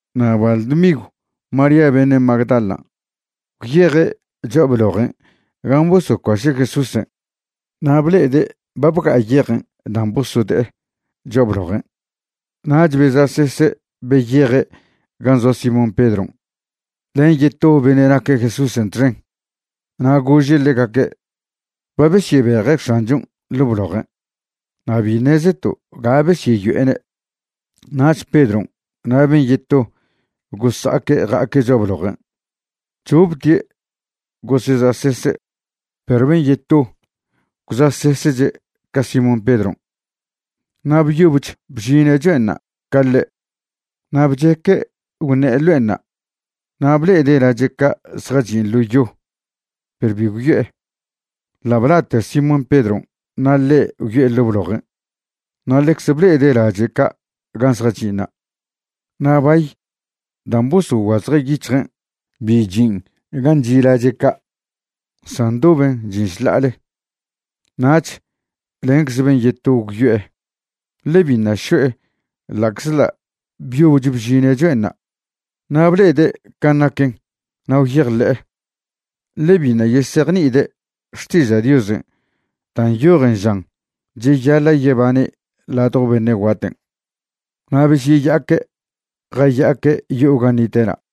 Na' bal dmigw María beṉe' Magdalan' gwyeje' cho'a blojen' gan' bosocuaše' Jesúsen' na' ble'ede' ba bga'a yejen' dan' bosode'e cho'a blojen'. Nach beza'sese' beyeje' gan' zoa Simón Pedron' len yeto beṉe' naque' Jesúsen' txen, na' gože' ḻegaque': ―Ba besyebeje' X̱anchon' ḻo' blojen' na' bi ṉezeto' ga besyeyo'ene'. Nach Pedron' na' ben' yeto gosa'aque' ja'aque' cho'a blojen'. Choptie' goseza'sese' perw ben' yeto gwza'sesche' ca Simón Pedron' na' byobech bžine' cho'enṉa' ca ḻe'. Na' bcheque' gwṉe'e ḻo'enṉa' na' ble'ede' lache' ca' zjachin' ḻo yo perw bi gwyo'e. Ḻa' bla'te Simón Pedron' na' ḻe' gwyo'e ḻo' blojen' na' ḻecze ble'ede' lache' ca' gan' zjachin'ṉa'. Na' bay dan' bosoguazje' yic̱hjen' bi chin' gan' chi' lache' ca', san ndoben chin' šḻa'ale. Nach lencze ben' yeto gwyo'e, ḻe biṉa' šo'e ḻa'czḻa' byobech bžine' cho'enṉa', na' ble'ede' can' naquen na' gwyejḻe'e. Ḻe biṉa' yesejni'ide' Xtiža' Diosen' da' nyojen žan cheyaḻa' yebane' ladjo beṉe' guaten'. Na' besyeya'aque' jaya'aque' yo'o gan' nite'na'.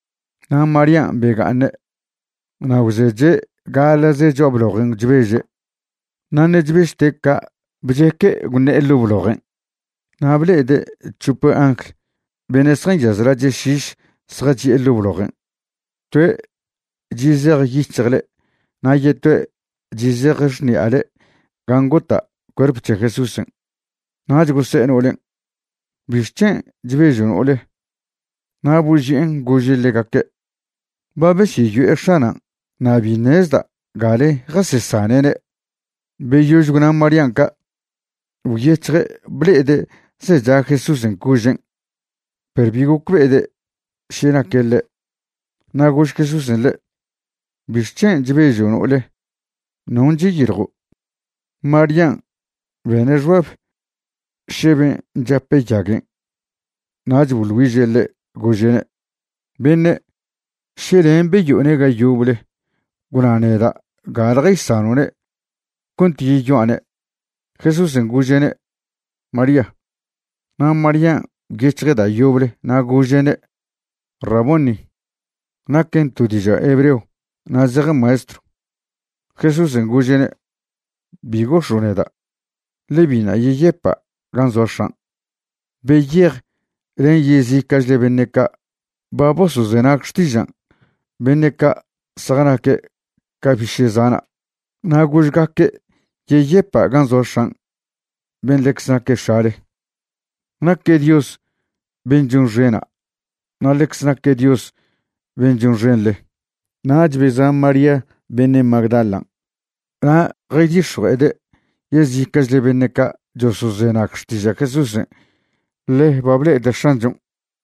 Na' Marían' bega'aṉe' na' gwzeche' gaḻa'ze cho'a blojen' chbeže'. Na' ṉe' chbežte' ca' bcheque' gwṉe'e ḻo' blojen'. Na' ble'ede' c̱hope angl beṉe' zjanyaz lache' šiš zjachi'e ḻo' blojen', toe' chi' zej yic̱hjle na' yetoe' chi' zej xṉi'ale gan' gota' cuerp c̱he Jesúsen'. Nach gose'e no'olen': ―¿Bixc̱hen' chbežo' no'ole? Na' boži'en gože' ḻegaque': ―Ba besyeyo'e X̱anan' na' bi ṉezda' gale jasesane'ne'. Beyož gwna' Marían' ca' gwyec̱hje' ble'ede' zecha Jesúsen' cožen', perw bi gocbe'ede' še naque' ḻe'. Na' gož Jesúsen' ḻe': ―¿Bixc̱hen' chbežo', no'ole? ¿Non' cheyiljo'? Marían' bene' xbab še ben' chape' yaguen' nach boḻ güiže' ḻe', gože'ne': ―Beṉe', še len' beyo'one' ga yoble, gwna neda' gale jaysano'ne' cont yeyoa'ne'. Jesúsen' gože'ne': ―¡María! Na' Marían' gwyec̱hje' da' yoble na' gože'ne': ―¡Raboni! ―naquen to diža' hebreo na' zejen Maestrw. Jesúsen' gože'ne': ―Bi gox̱o' neda', ḻe biṉa' yeyepa' gan' zoa X̱an'. Beyej len yezica'chle beṉe' ca' ba bosozenag xtižan' beṉe' ca' zjanaque' ca biše' zana', na' gožgaque' yeyepa' gan' zoa X̱an' ben' ḻecz naque X̱ale. Naque' Dios ben' chonxena' na' ḻecze naque' Dios ben' chonxenḻe. Nach beza' María beṉe' Magdalan' na' jaydix̱jue'ede' yezica'chle beṉe' ca' chosozenag xtiža' Jesúsen' ḻe ba ble'ede' X̱anchon'.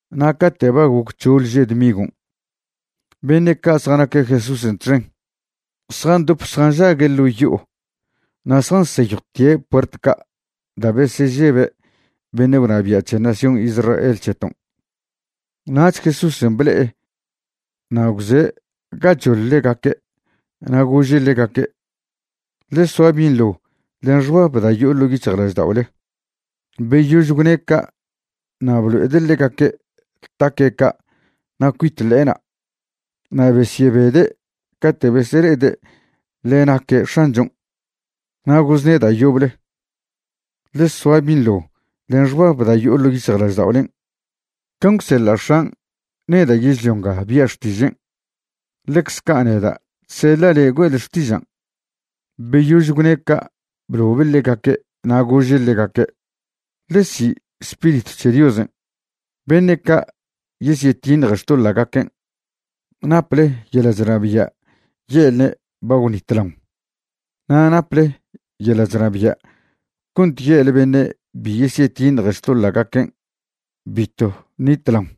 Na' cate' ba goc c̱hoḻ že' dmigon', beṉe' ca' zjanaque' Jesúsen' txen zjandop zjanžague' ḻo' yo'o na' zjanseyjwtie' puert ca' da' besežebe' beṉe' gwnabia' c̱he nación Israel c̱heton'. Nach Jesúsen' ble'e na' gwze' gachoḻ ḻegaque'. Na' gože' ḻegaque': ―Ḻe soa binḻo len xbab da' yo'o ḻo' yic̱hjlažda'ole. Beyož gwne' ca' na' blo'ede' ḻegaque' taque' ca' na' cuit ḻe'ena'. Na' besyebede' cate' besele'ede' ḻe naque' X̱anchon'. Na' gozne' da' yoble: ―Ḻe soa binḻo len xbab da' yo'o ḻo' yic̱hjlažda'olen'. Can' gwseḻa' X̱an' neda' yežlio nga bia' xtižen', ḻecze ca' neda' chseḻa' le'e güe'le xtižan'. Beyož gwne' ca' blobe' ḻegaque' na' gože' ḻegaque': ―Ḻe si' Spiritw c̱he Diosen'. Beṉe' ca' yesyetiṉje xtoḻa'gaquen', naple yeḻa' chnabia' ye'lne' ba gwnitlaon, na' naple yeḻa' chnabia' cont ye'le beṉe' bi yesyetiṉje xtoḻa'gaquen' bitw ṉitlaon.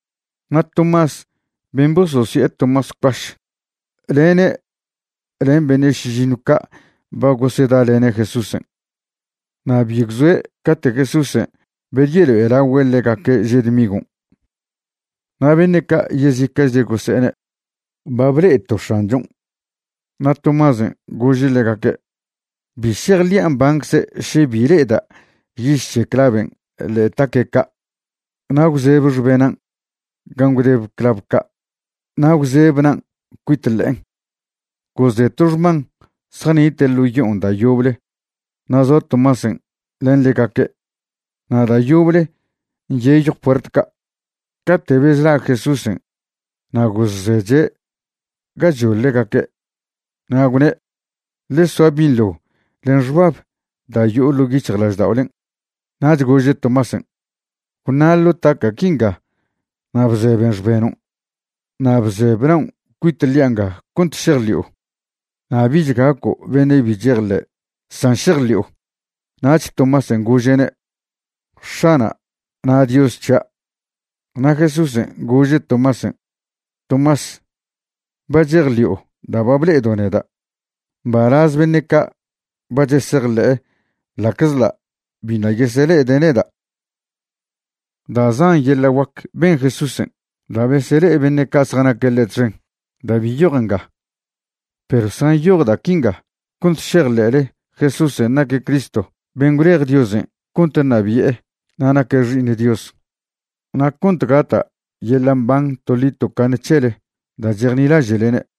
Na' Tomás ben' bososi'e Tomás Cuaš lene' len beṉe' šižiṉw ca' ba gosedalene' Jesúsen', na' bi gwzoe' cate' Jesúsen' bedyelo'elagüe' ḻegaque' že' dmigon'. Na' beṉe' ca' yezica'chle gose'ene': ―Ba ble'eto' X̱anchon'. Na' Tomásen' gože' ḻegaque': ―Bi šejḻi'a mbancze' še bi le'eda' yiž c̱he claven' ḻe'e taque' ca' na' gwzebe xbenan' gan' gwdebe clav ca' na' gwzebe na'an cuit ḻe'en. Gozde' to xman zjanite' ḻo' yo'on da' yoble na' zoa Tomásen' len ḻegaque'. Na' da' yoble nyeyjw puert ca', cate' bezla' Jesúsen' na' gozzeche' gachoḻ ḻegaque'. Na' gwne': ―Ḻe soa binḻo len xbab da' yo'o ḻo' yic̱hjlažda'olen'. Nach gože' Tomásen': ―Gwṉa' ḻo' taca' quinga na' bzeben xbenon'. Na' bzebe naon' cuit ḻi'a nga cont šejḻi'o. Na' bich gaco' beṉe' bi chejḻe', san šejḻi'o. Nach Tomásen' gože'ne': ―¡X̱ana' na' Dios c̱hia'! Na' Jesúsen' gože' Tomásen': ―Tomás, ba chejḻi'o da' ba ble'edo' neda'. Mbalaz beṉe' ca' ba chesejḻe'e ḻa'czḻa' biṉa' yesele'ede' neda'. Da' zan yeḻa' guac ben Jesúsen' da' besele'e beṉe' ca' zjanaque' ḻe' txen da' bi nyojen nga. Perw zjanyoj da' quinga cont šejḻe'le Jesúsen' naque' Cristo ben' gwlej Diosen' cont ṉabi'e na' naque' Xi'iṉ Dios, na' cont gata' yeḻa' mban toḻi tocaṉe c̱hele da' chejnilaže'lene'.